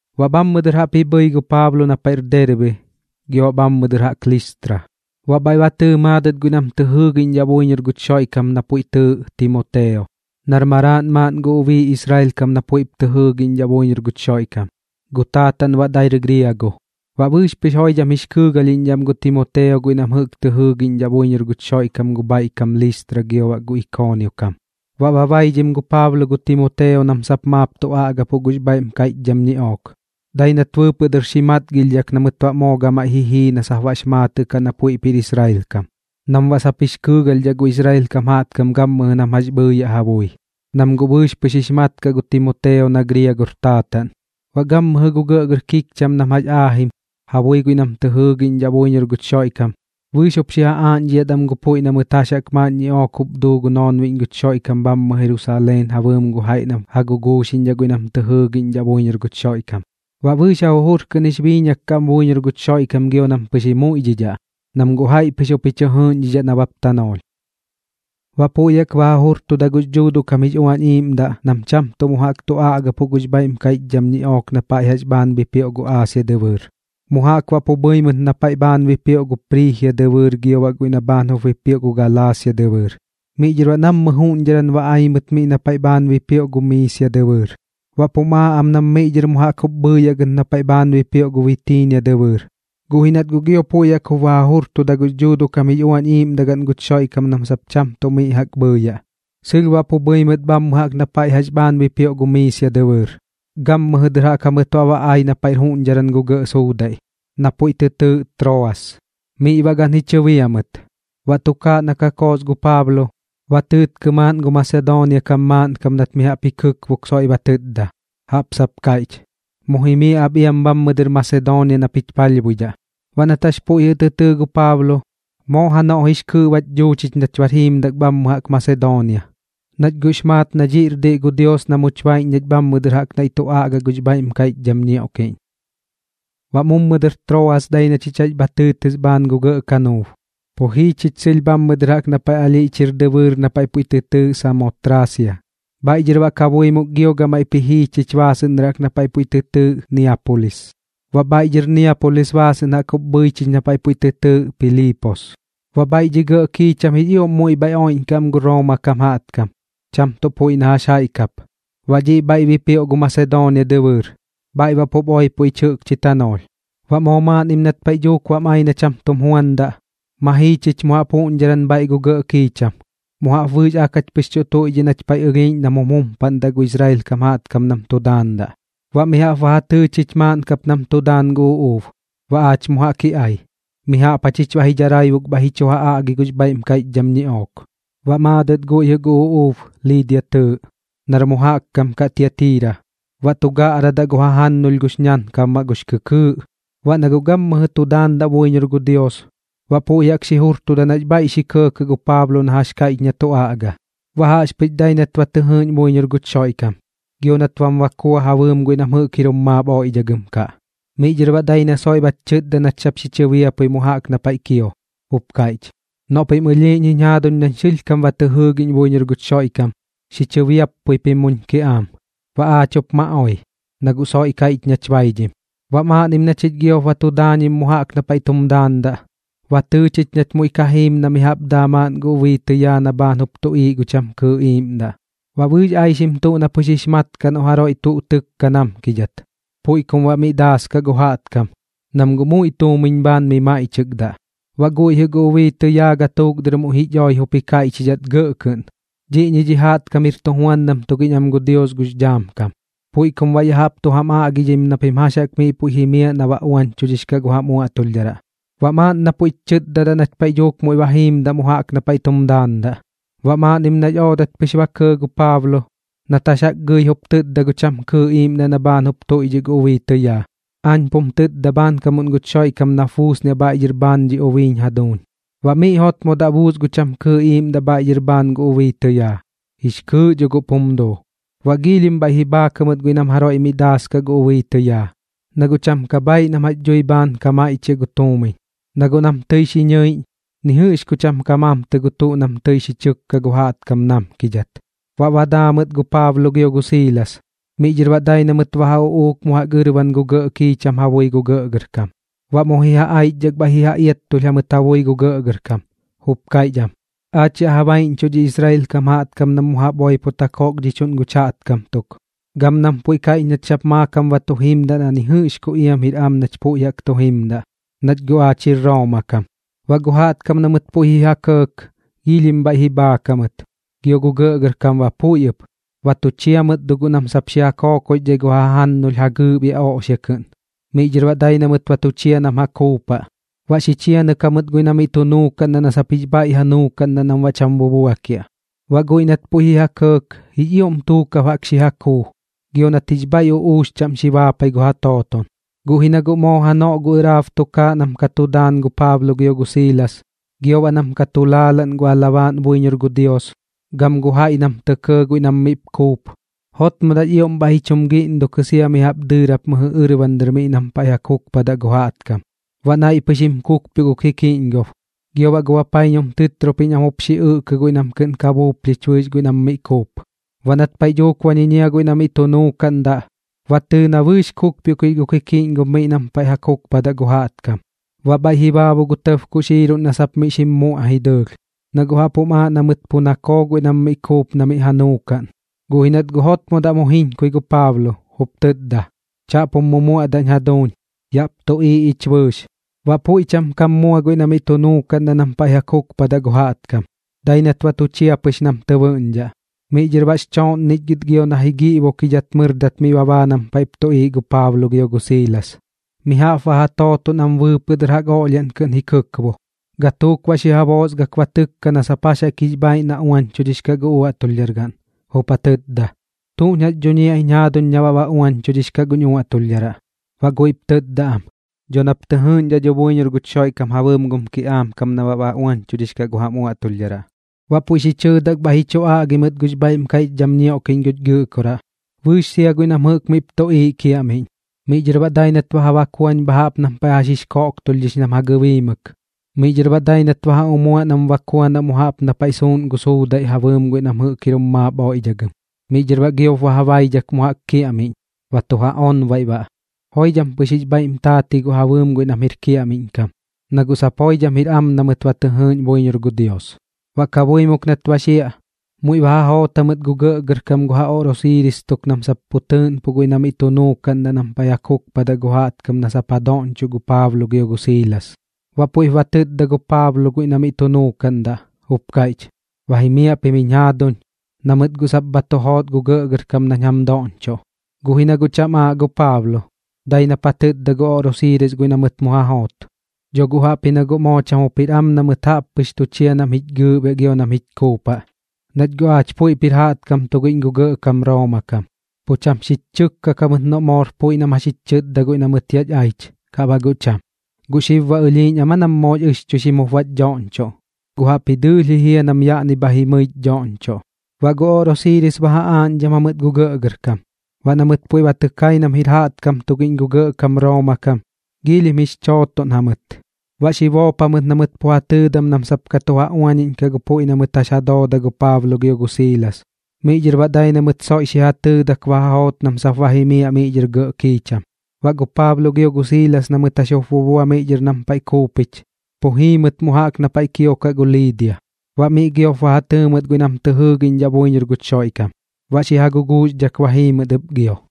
Baꞌ bhammɨ dɨr jaꞌp ji bhɨi gu Paablo na paiꞌr Derbe gio baꞌ bhammɨ jaꞌk Listra, baꞌ bhaiꞌ ba tɨɨ maadɨt guiꞌ nam tɨ jɨɨgiꞌñdhaꞌ buiñor guch Xoiꞌkam na puiꞌ tɨɨꞌ Timoteo, nar maraaꞌn maaꞌn gu ubii Israel kam na puiꞌp tɨ jɨɨgiꞌñdhaꞌ buiñor guch Xoiꞌkam, gu taataꞌn baꞌ dair griago. Baꞌ bɨɨx pɨx joidham jix kɨɨgalhiꞌñdhaꞌ am gu Timoteo guiꞌ nam jɨꞌk tɨ jɨɨgiꞌñdhaꞌ buiñor guch Xoiꞌkam gu bhaiꞌ kam Listra gio baꞌ gu Ikoonio kam. Baꞌ ba baidhim gu Paablo gu Timoteo nam sap maap tu aꞌgapuꞌ gux bhaiꞌm kaiꞌchdham ñiꞌook, dai nat bɨɨpɨꞌ dɨr xi matgilhdhak na mɨt baꞌ moo gamaiꞌ ji jii na sap baꞌx maatɨꞌ kaꞌ na puiꞌp jir Israel kam, nam baꞌ sap jix kɨɨgalhdhaꞌ gu Israel kam jaꞌtkam gammɨjɨ nam jax bhɨɨyaꞌ ja bui, nam guꞌ bɨɨx pɨx jup jix mat kaꞌ gu Timoteo na griagor taataꞌn. Baꞌ gammɨjɨ gu gɇꞌgɇr kikcham nam jax aajim ja bui guiꞌ nam tɨ jɨɨgiꞌñdhaꞌ buiñor guch Xoiꞌkam, bɨɨx jup xi ja aaꞌñdhidhat am gu puiꞌ na mɨt jax jaꞌk maaꞌn ñiꞌook jup duu gu noonbiꞌñ guch Xoiꞌkam bhammɨ Jerusaleen ja bɨɨm gu jaiꞌ nam ja guguuxiꞌñdhaꞌ guiꞌ nam tɨ jɨɨgiꞌñdhaꞌ buiñor guch Xoiꞌkam. Baꞌ bɨɨx ja jujur kɨꞌn jix biiñak kaꞌ am buiñor guch Xoiꞌkam gio nam pɨx ji muiꞌdhidhaꞌ, nam guꞌ jaiꞌ pɨx jup ji chɨ jɨɨꞌñdhidhaꞌ nabap tanoolh. Baꞌ puiꞌ jaꞌk ba ja jujurtuda gux Dhuuduꞌ kam jix Uañ Iiꞌmdaꞌ nam cham tuꞌ mu jaꞌk tu aꞌgapuꞌ gux bhaiꞌm kaiꞌchdham ñiꞌook na paiꞌ jax bhaan bipioꞌ gu Aasia dɨbɨɨr, mu jaꞌk baꞌ pu bhɨi mɨt na paiꞌ bhaan bipioꞌ gu Priijia dɨbɨɨr gio baꞌ guiꞌ na bhaan jup bipioꞌ gu Galaasia dɨbɨɨr. Miꞌ dhɨr baꞌ nammɨ juꞌñdharan ba ai mɨt miꞌ na paiꞌ dhɨr bhaan ba bipioꞌ gu Miisia dɨbɨɨr. Baꞌp jum aaꞌ am nam miꞌ dhɨr mu jaꞌk jup bhɨɨyaꞌ gɨt na paiꞌ bhaan bipioꞌ gu Bitiinia dɨbɨɨr, guꞌ ji nat guꞌ gio puiꞌ jaꞌk jup ba ja jujurtuda gux Dhuuduꞌ kam jix Uañ Iiꞌmdaꞌ gaꞌn guch Xoiꞌkam nam sap cham tuꞌ miꞌ jaꞌk bhɨɨyaꞌ. Sɨlh baꞌ pu bhɨi mɨt gammɨjɨ na paiꞌ jax bhaan bipioꞌ gu Miisia dɨbɨɨr, gammɨjɨ dɨr jaꞌk jamɨt baꞌ ba ai na paiꞌr juꞌñdharan gu gɇꞌ suudaiꞌ, na puiꞌ tɨ tɨɨꞌ Troas. Miꞌ baꞌ gan ji chɨbia mɨt. Baꞌ tukaaꞌ na ka koos gu Paablo, ba tɨɨtkɨ maaꞌn gu Masedoonia kam maaꞌnkam nat mi jaꞌp ji kɨkbok soiꞌ ba tɨtda, jaꞌp sap kaiꞌch: “Mu jimiaꞌ ap iam bhammɨ dɨr Masedoonia nap jich palhbuidhaꞌ.” Baꞌ nat jax puiꞌ jɨꞌ tɨ tɨɨ gu Paablo, moo janoꞌ jix kɨɨꞌ bach dhuu chich nach bar jiimdak bhammɨ dɨr jaꞌk Masedoonia, nach guꞌx maat na dhiꞌr diꞌ gu Dios na much baiꞌñ nach bhammɨ dɨr jaꞌp naiꞌ tu aꞌgaꞌ gux bhaiꞌm kaiꞌchdham ñioꞌkiꞌñ. Baꞌ mummɨ dɨr Troas dai na chich jax bha tɨɨtɨs bhaan gu gɇꞌ kanuub, pu jii chich sɨlh bhammɨ dɨr jaꞌk na paiꞌ ɨlhiꞌch jir dɨbɨɨr na puiꞌ tɨ tɨɨꞌ Samotraasia. Bhaiꞌ dhɨr baꞌ kabuimuk gio gamaiꞌp ji jii chich baasɨꞌn dɨr jaꞌk na paiꞌ puiꞌ tɨ tɨɨꞌ Niapulis. Baꞌ bhaiꞌ dhɨr Niapulis baasɨꞌn jaꞌk jup bhɨi chich na paiꞌ puiꞌ tɨ tɨɨꞌ Piliipos, baꞌ bhaiꞌ dhi gɇꞌ kiicham jix ioꞌm muiꞌ bha oiꞌñkaꞌ am gu Rooma kam jaꞌtkam, cham tuꞌ puiꞌ na jaiꞌ kap. Baꞌ dhiꞌ bhaan bipioꞌ gu Masedoonia dɨbɨɨr, bhaiꞌ baꞌ pup oipo ich jɨꞌkchi tanoolh. Baꞌ moo maaꞌnnim nat paiꞌ dhuuk bam ai na cham tum juandaꞌ, ma jii chich mu jaꞌp juꞌñdharan bhaiꞌ gu gɇꞌ kiicham, mu jaꞌp bɨɨx ak jach pɨx tu tuiꞌdhiꞌ nach paiꞌ ɨlhiiꞌñ nam jum jumpaꞌndaꞌ gu Israel kam jaꞌtkam nam tu daandaꞌ. Baꞌ mi jaꞌp ba ja tɨɨ chich maaꞌn kap nam tu daan gu uꞌuub, baꞌ aach mu jaꞌk ji ai. Mi jaꞌp jachich baꞌ ji dharaibuk bhaiꞌ ji chu ja aꞌgi gux bhaiꞌm kaiꞌchdham ñiꞌook. Baꞌ maadɨt guiꞌ jɨꞌ gu uꞌuub Liidia tɨɨꞌ, nar mu jaꞌk kam kaꞌ Tiatiira, baꞌ tu gaꞌradaꞌ gu jajannulh gux ñakaabmaꞌ gux kɨkɨɨꞌ. Baꞌ na guꞌ gammɨjɨ tu daandaꞌ buiñor gu Dios, baꞌ puiꞌ jaꞌk xi jurtuda nax bhaiꞌ xi kɇɇkɇꞌ gu Paablo na jax kaiꞌch na tu aꞌga. Baꞌ jaꞌxpɨx dai nat ba tɨ jɨɨꞌñ buiñor guch Xoiꞌkam, gio baꞌ nat bam bakua ja bɨɨm guiꞌ nam jɨꞌk jir jum maap oiꞌdhagɨm kaꞌ. Miꞌ dhɨr baꞌ dai na soiꞌ bach chɨtda nach sap xi chɨbiappui mu jaꞌk na paiꞌ kio, jup kaiꞌch: ―Noꞌ pim ɨlhiiꞌñ jiñ jaaduñ nañ sɨlhkam ba tɨ jɨɨgiꞌñ buiñor guch Xoiꞌkam, xi chɨbiappui pim muñ kiꞌaam. Baꞌ aach jup ma oi, na guꞌ soiꞌ kaiꞌch nach baidhim. Baꞌ maaꞌnnim na chich giop ba tu daañim mu jaꞌk na paiꞌ tum daandaꞌ, ba tɨɨ chich nach muiꞌ ka jiim na mi jaꞌp daa maaꞌn gu ubii tɨyaa na bhaan jup tuꞌiiꞌ gu cham kɨɨꞌ iiꞌmdaꞌ. Baꞌ bɨɨx aixim tuꞌ na pɨx jix mat kaꞌ noꞌ jaroiꞌ tuꞌ tɨkka namkidhat, puiꞌ kum baꞌ miꞌ daaskaꞌ gu jaꞌtkam, nam guꞌ muiꞌ tuumiñ bhaan mi maiꞌchɨkdaꞌ. Baꞌ guiꞌ jɨꞌ gu ubii tɨyaa gatuuk dɨr muiꞌ jich oi jup kaiꞌchim gɇꞌ kɨꞌn: ―Dhiꞌñi dhi jaꞌtkam jir tujuandam tugiꞌñ am gu Dios gux dhaam kam. Puiꞌ kum baꞌ ya jaꞌp tu jam aꞌgidhim na pim jax jaꞌk miꞌ puiꞌ jimiaꞌ na baꞌ uañchudhix kaꞌ gu jam uaꞌtulhdharaꞌ. Baꞌ maaꞌn na puiꞌch chɨtda nach paiꞌ dhuuk muiꞌ ba jiimdaꞌ mu jaꞌk na paiꞌ tum daandaꞌ. Baꞌ maaꞌnnim nax oodat pɨx ba kɇɇ gu Paablo, nat jax jaꞌk gɨi jup tɨtda gu cham kɨɨꞌ iiꞌmdaꞌ na bhaan jup tuiꞌdhiꞌ gu ubii tɨyaa: ―Aañ pum tɨtda bhaankamuꞌn guch Xoiꞌkam nap buusniaꞌ bhaiꞌ dhɨr bhaan dhi ubiiñ jaduuñ. Baꞌ miꞌ jotmodaꞌ buus gu cham kɨɨꞌ iiꞌmdaꞌ bhaiꞌ dhɨr bhaan gu ubii tɨyaa, jix kɨɨꞌ dho guꞌp jum duu. Baꞌ giilhim bhaiꞌ ji bhaak jamɨt guiꞌ nam jaroiꞌ miꞌ ka daaskaꞌ gu ubii tɨyaa, na guꞌ cham ka bhaaiꞌ nam jax dhui bhaan ka maiꞌchiaꞌ gu tuumiñ. Na guꞌ nam tɨi xi ñɨiꞌñ, ni jɨꞌx ku cham ka mamtɨ gu tuꞌ nam tɨi xi chɨkka gu jaꞌtkam namkidhat. Baꞌ ba daa mɨt gu Paablo gio gu Siilas, miꞌ dhɨr baꞌ dai na mɨt ba ja uꞌuuk mu jaꞌk ɨrban gu gɇꞌ kiicham ja bui gu gɇꞌgɇrkam. Baꞌ mu ji ja aichdhak bhaiꞌ ji ja iattulh jamɨt ja bui gu gɇꞌgɇrkam, jup kaiꞌch am: ―Aach yaꞌ ja baiꞌñchuꞌ dhi Israel kam jaꞌtkam nam mu jaꞌp oipot ja kokdhichuꞌn guch jaꞌtkam tuk, gam nam puiꞌ kaiꞌch nach sap maakam ba tu jimdaꞌ na jax jaꞌk ni jɨꞌx ku iam jir am nach puiꞌ jaꞌk tu jimdaꞌ, nach guꞌ aach jir Rooma kam. Baꞌ gu jaꞌtkam na mɨt puiꞌ jɨꞌ ji ja kɇɇk, giilhim bhaiꞌ ji bhaak jamɨt, gio gu gɇꞌgɇrkam ba puiꞌ ɨp. Ba tu chia mɨt dho guꞌ nam xi ja kookoxdhai gu ja jannulh ja gɨɨꞌbiaꞌ oꞌxia kɨꞌn. Miꞌ dhɨr baꞌ dai na mɨt ba tu chia nam ja kuupaꞌ, baꞌ xi chianɨk jamɨt guiꞌ na miꞌ tu nuukaꞌndaꞌ na sap jix bhaiꞌ ja nuukaꞌndaꞌ nam baꞌ cham bubuakiaꞌ. Baꞌ guiꞌ nat puiꞌp ji ja kɇɇk, jix ioꞌm tuukab jaꞌk xi ja kuu gio nat jix bhaiꞌ uꞌuux chaꞌm xi baapai gu ja tooton. Guꞌ ji na guꞌ moo janoꞌ gu ɨraab tukaaꞌ nam ka tu daan gu Paablo gio gu Siilas, gio baꞌ nam ka tu laalaꞌn gu alabaaꞌn buiñor gu Dios, gam gu jaiꞌ nam tɇ kɇɇ guiꞌ nam miꞌp kuup, jotmodaꞌx ioꞌm bhaiꞌ ji chum giꞌndukɨ sia mi jaꞌp dɨɨrap mɨjɨ ɨrban dɨr miꞌ nam paiꞌ ja kukpadaꞌ gu jaꞌtkam. Baꞌ naiꞌ pɨx jim kukpioꞌ gu kikiꞌñgob, gio baꞌ gu bapaiñum tɨtropiñ am jup xi ɨꞌkɨ guiꞌ nam kɨꞌn ka buuplhich bɨɨx guiꞌ nam miꞌ kuup. Baꞌ nat paiꞌ dhuuk ba ñiñia guiꞌ na miꞌ tu nuukaꞌndaꞌ, ba tɨɨ na bɨɨx kukpioꞌkix gu kikiꞌñgob miꞌ nam paiꞌ ja kukpadaꞌ gu jaꞌtkam. Baꞌ bhaiꞌ ji baabu gu tɇb kuxiiruꞌn na sap miꞌ xim muꞌai dɨɨlh, na guꞌ jaꞌp jum aaꞌ na mɨt pu nakoo guiꞌ nam miꞌ kuup na miꞌ ja nuukaꞌn. Guꞌ ji nat guꞌ jotmodaꞌ mu jiñkui gu Paablo, jup tɨtda: ―Chaꞌp jum mumuaꞌdaꞌñ jaduuñ. Yaꞌp tuꞌiiꞌ ich bɨɨx. Baꞌ puiꞌ cham kam mua guiꞌ na miꞌ tu nuukaꞌndaꞌ nam paiꞌ ja kukpadaꞌ gu jaꞌtkam, dai nat ba tu chia pɨx nam tɨ bɨꞌñdhaꞌ. Miꞌ dhɨr baꞌx chooꞌnnichgɨt gio na ji giꞌbokidhat mɨrdat miꞌ ba baa nam paiꞌp tuꞌiiꞌ gu Paablo gio gu Siilas, mi jaꞌp baꞌ ja tooton am bɨɨpɨꞌ dɨr jaꞌk oꞌlhiaꞌn kɨꞌn ji kɨkbo. Gatuuk baꞌ xi ja boosgak ba ja tɨkka na sap jax jaꞌk jix bhaaiꞌ na uañchudhix kaꞌ gu uaꞌtulhdhar gaꞌn, jup ja tɨtda: ―¿Tuꞌñ jax dhuñiaꞌñ jaaduñ na baꞌ ba uañchudhix kaꞌ guñ uaꞌtulhdharaꞌ? Baꞌ guiꞌp tɨtda am: ―Dho nap tɨ jɨɨꞌñdhaꞌ dho buiñor guch Xoiꞌkam ja bɨɨm gum kiꞌaam kam na baꞌ ba uañchudhix kaꞌ gu jam uaꞌtulhdharaꞌ. Baꞌ puiꞌ xi chɨɨdak bhaiꞌ ji chu aꞌgi mɨt gux bhaiꞌm kaiꞌchdham ñioꞌkiꞌñ guch Gɨꞌkoraꞌ, bɨɨx sia guiꞌ nam jɨꞌk miꞌp tuꞌiiꞌ kiaꞌmiꞌñ. Miꞌ dhɨr baꞌ dai nat ba ja bakuañ bha jaꞌp nam paiꞌ jax jix koꞌktulhdhix nam ja gɨbiimɨk. Miꞌ dhɨr baꞌ dai nat ba ja umuaꞌ nam bakuanaꞌ mu jaꞌp na paiꞌ suuꞌn gu suudaiꞌ ja bɨɨm guiꞌ nam jɨꞌk jir jum maap oiꞌdhagɨm. Miꞌ dhɨr baꞌ giop ba ja baidhak mu jaꞌk kiaꞌmiꞌñ, ba tu ja onbaiꞌ baꞌ, joidham pɨx jix bhaiꞌm taat ji guꞌ ja bɨɨm guiꞌ nam jir kiaꞌmiꞌñ kam, na guꞌ sap joidham jir am na mɨt ba tɨ jɨɨꞌñ buiñor gu Dios. Baꞌ kabuimuk nat ba xiaꞌ, muiꞌ ba ja joot jamɨt gu gɇꞌgɇrkam gu ja oꞌrosiiris tuk nam sap pu tɨɨꞌnpuꞌ guiꞌ na miꞌ tu nuukaꞌndaꞌ nam paiꞌ ja kukpadaꞌ gu jaꞌtkam na sap ja doꞌñchoꞌ gu Paablo gio gu Siilas. Baꞌ puiꞌp ba tɨtda gu Paablo guiꞌ na miꞌ tu nuukaꞌndaꞌ, jup kaiꞌch: ―Ba jimiaꞌ pim jiñ jaaduñ, na mɨt guꞌ sap bha tu joot gu gɇꞌgɇrkam nañ jam doꞌñchoꞌ. Guꞌ ji na guꞌ cham aaꞌ gu Paablo, dai nap ja tɨtda gu oꞌrosiiris guiꞌ na mɨt mu ja joot: ―Dho guꞌ jaꞌpji na guꞌ moo cham jup jir am na mɨt jaꞌp pɨx tu chia nam jich gɨɨꞌbiaꞌ gio nam jich kuupaꞌ, nach guꞌ aach puiꞌp jir jaꞌtkam tugiꞌñ gu gɇꞌkam Rooma kam. Pu cham xich chɨkkak jamɨt noꞌ moor puiꞌ nam jax jich chɨtda guiꞌ na mɨt yach aich, kaꞌ baꞌ guꞌ cham. ¿Gu xib baꞌ ɨlhiiꞌñ am aa nam moox ɨxchuixim jup bach dhoꞌñchoꞌ? Guꞌ jaꞌpji dɨɨlh ji jia nam yaꞌni bha jimɨich dhoꞌñchoꞌ. Baꞌ gu oꞌrosiiris ba ja aaꞌñdham jamɨt gu gɇꞌgɇrkam. Baꞌ na mɨt puiꞌ ba tɨ kai nam jir jaꞌtkam tugiꞌñ gu gɇꞌkam Rooma kam, giilhim jix chootoꞌn jamɨt. Baꞌ xi boop jamɨt na mɨt pu ja tɨɨdam nam sap ka tu ja uañiꞌñkaꞌ gu puiꞌ na mɨt jɨꞌk jax ja dooda gu Paablo gio gu Siilas. Miꞌ dhɨr baꞌ dai na mɨt soiꞌ xi ja tɨɨdak ba ja joot nam sap ba jimiaꞌ miꞌ dhɨr gɇꞌ kiicham. Baꞌ gu Paablo gio gu Siilas na mɨt jax jup bubua miꞌ dhɨr nam paiꞌ kuupich, pu jii mɨt mu jaꞌk na paiꞌ kiokaꞌ gu Liidia. Baꞌ miꞌ giop ba ja tɨɨ mɨt guiꞌ nam tɨ jɨɨgiꞌñdhaꞌ buiñor guch Xoiꞌkam, baꞌ xi ja guguuxdhak ba jii mɨt ɨp gio.